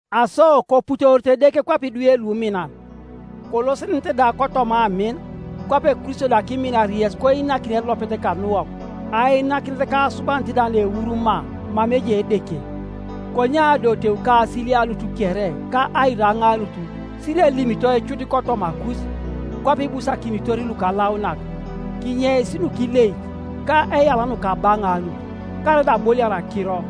Aso koputorito Edeke kwape idwe luminan. Kolosenenete da kotoma amin, kwape Kristo da kiminar yes koinakin elopet kanuwok, ainakinet ka asubanit da naeuru maa mama ejai Edeke. Konye adoteu ka asilianut kere ka airaŋaanut sirielimitoi cut kotomakus, kwape ibusakinitor lukalaunak. Kinyeis nukileic, ka eyala nukabaŋaanut, karaida aboliar akiro,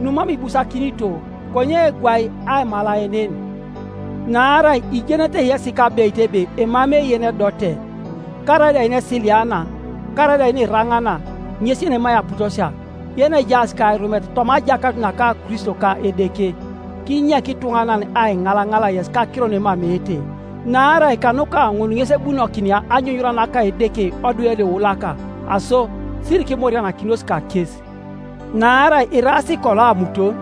numam ibusakinito; konye gwai aimalaenen. Naarai ijenete yesi kabeit ebe emamei yenedote, karaida yenesiliana, karaida yeniranaana, ŋes yenemai aputosia, yenejaas kairumet toma ajakanut naka Kristo ka Edeke. Kinyek ituŋanan aiŋalaŋal yes kakiro nuemameete, naarai kanuka ŋun ŋes ebunokinia anyunyura naka Edeke odwe luiulaka. Aso sirikimorianakinos kakes, naarai iraas kolo amuton,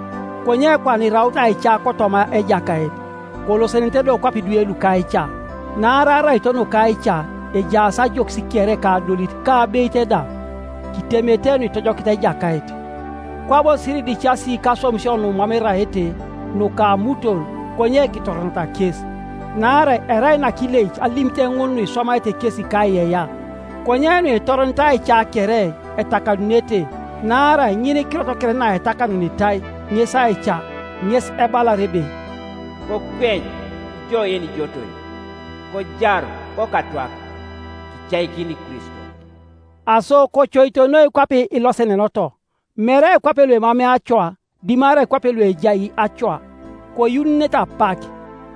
konye kwana iraut aica kotoma Ejakait; kolosenenete do kwape idwe luka aica. Naarai araito nuka aica ejaas ajokis kere ka adolit ka abeit da. Kitemete nuitojokit Ejakait. Kwabo siridicasi kaswamisio numam eraete, nuka amuton, konye kitoronata kes. Naarai erai nakileic alimit ŋun nuiswamaete kesi kaiyeiyea; konye nuitoronit aica kere, etakanunete, naarai ŋinikirot kere naetakanunitai, ŋes aica. Ŋes ebalar ebe, “Kokweny, ijo yenijotoi, kojaru kokatwak, Kicaikini Kristo.” Aso kocoito noi kwape ilosenenoto, mere kwape luemamei acoa, dimarai kwape luejai acoa, koyuununete apak,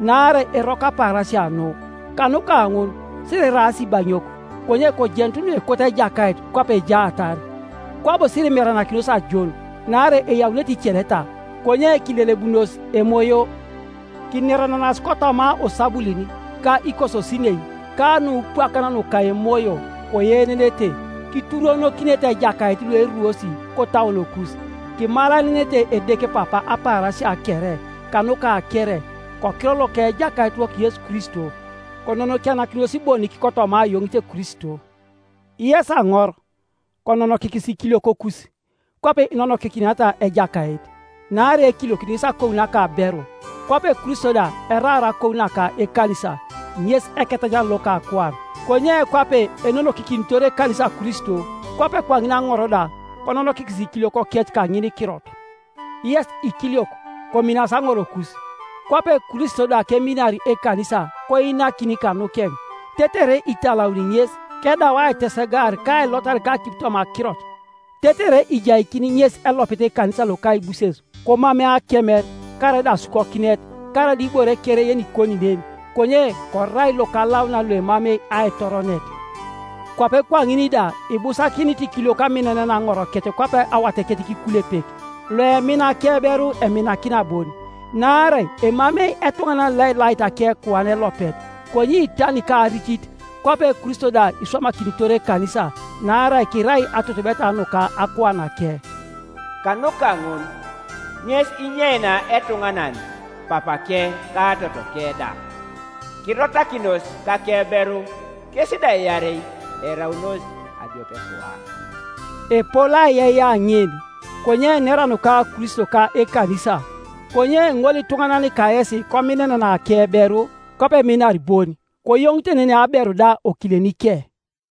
naarai eroko apaarasia nu. Kanuka ŋun siriraas ibaŋiok, konye kojenut nuekot Ejakait kwape ejaatar. Kwabo sirimeranakinos ajon, naarai eyaunete iceleta; konye kilelebununos Emoyo, kinerenenas kotoma osabulin, ka ikososinei, ka nupwakan nuka emoyo, koyeenenete, kituruonokinete Ejakait lueruos kotauonokus, kimalaenenete Edeke Papa apaarasia kere, kanuka kere, kokiror loka Ejakaitiwok Yesu Kristo. Kononokianakinos bonik kotoma ayoŋit Kristo. Yes aŋor, kononokikis ikiliokokus kwape inonokikiniata Ejakait, naarai ekiliokit ŋes akou naka aberu, kwape Kristo da eraar akou naka ekanisa, ŋes Eketajaran loka akuan. Konye kwape enonokikinitor ekanisa Kristo, kwape kwaŋin aŋor da kononokikis ikiliokokec kaŋinikirot. Yes ikiliok, kominasi aŋorokus, kwape Kristo da keminar ekanisa koinakin kanukeŋ, tetere italauni ŋes, kedau aitesegaar kailotar kakipi toma akirot, tetere ijaikini ŋes elopet ekanisa lokaibuses, komamei akemer, karaida asukokinet, karaida ibore kere yenikoni nen, konye korai lokalaunan, loemamei aitoronet, Kwape kwaŋin da ibusakinit ikiliok aminenena aŋorokec kwape awatekec kikulepek. Loemina akeberu eminakina bon. Naarai emamei etuŋanan loelait akekuan elopet, konye itani ka aricit, kwape Kristo da iswamakinitor ekanisa, naarai kirai atutubeta nuka akuanake. “Kanuka ŋun ŋes inyeinia etuŋanan papake ka totoke da, kirotakinos kakeberu, kes da iarei eraunos adiopekuan.” Epol aiyeiyea ŋin, konye enera nuka Kristo ka ekanisa. Konye ŋolituŋanan kayesi kominenena akeberu, kwape eminar bon, koyoŋitenenei aberu da okilenike.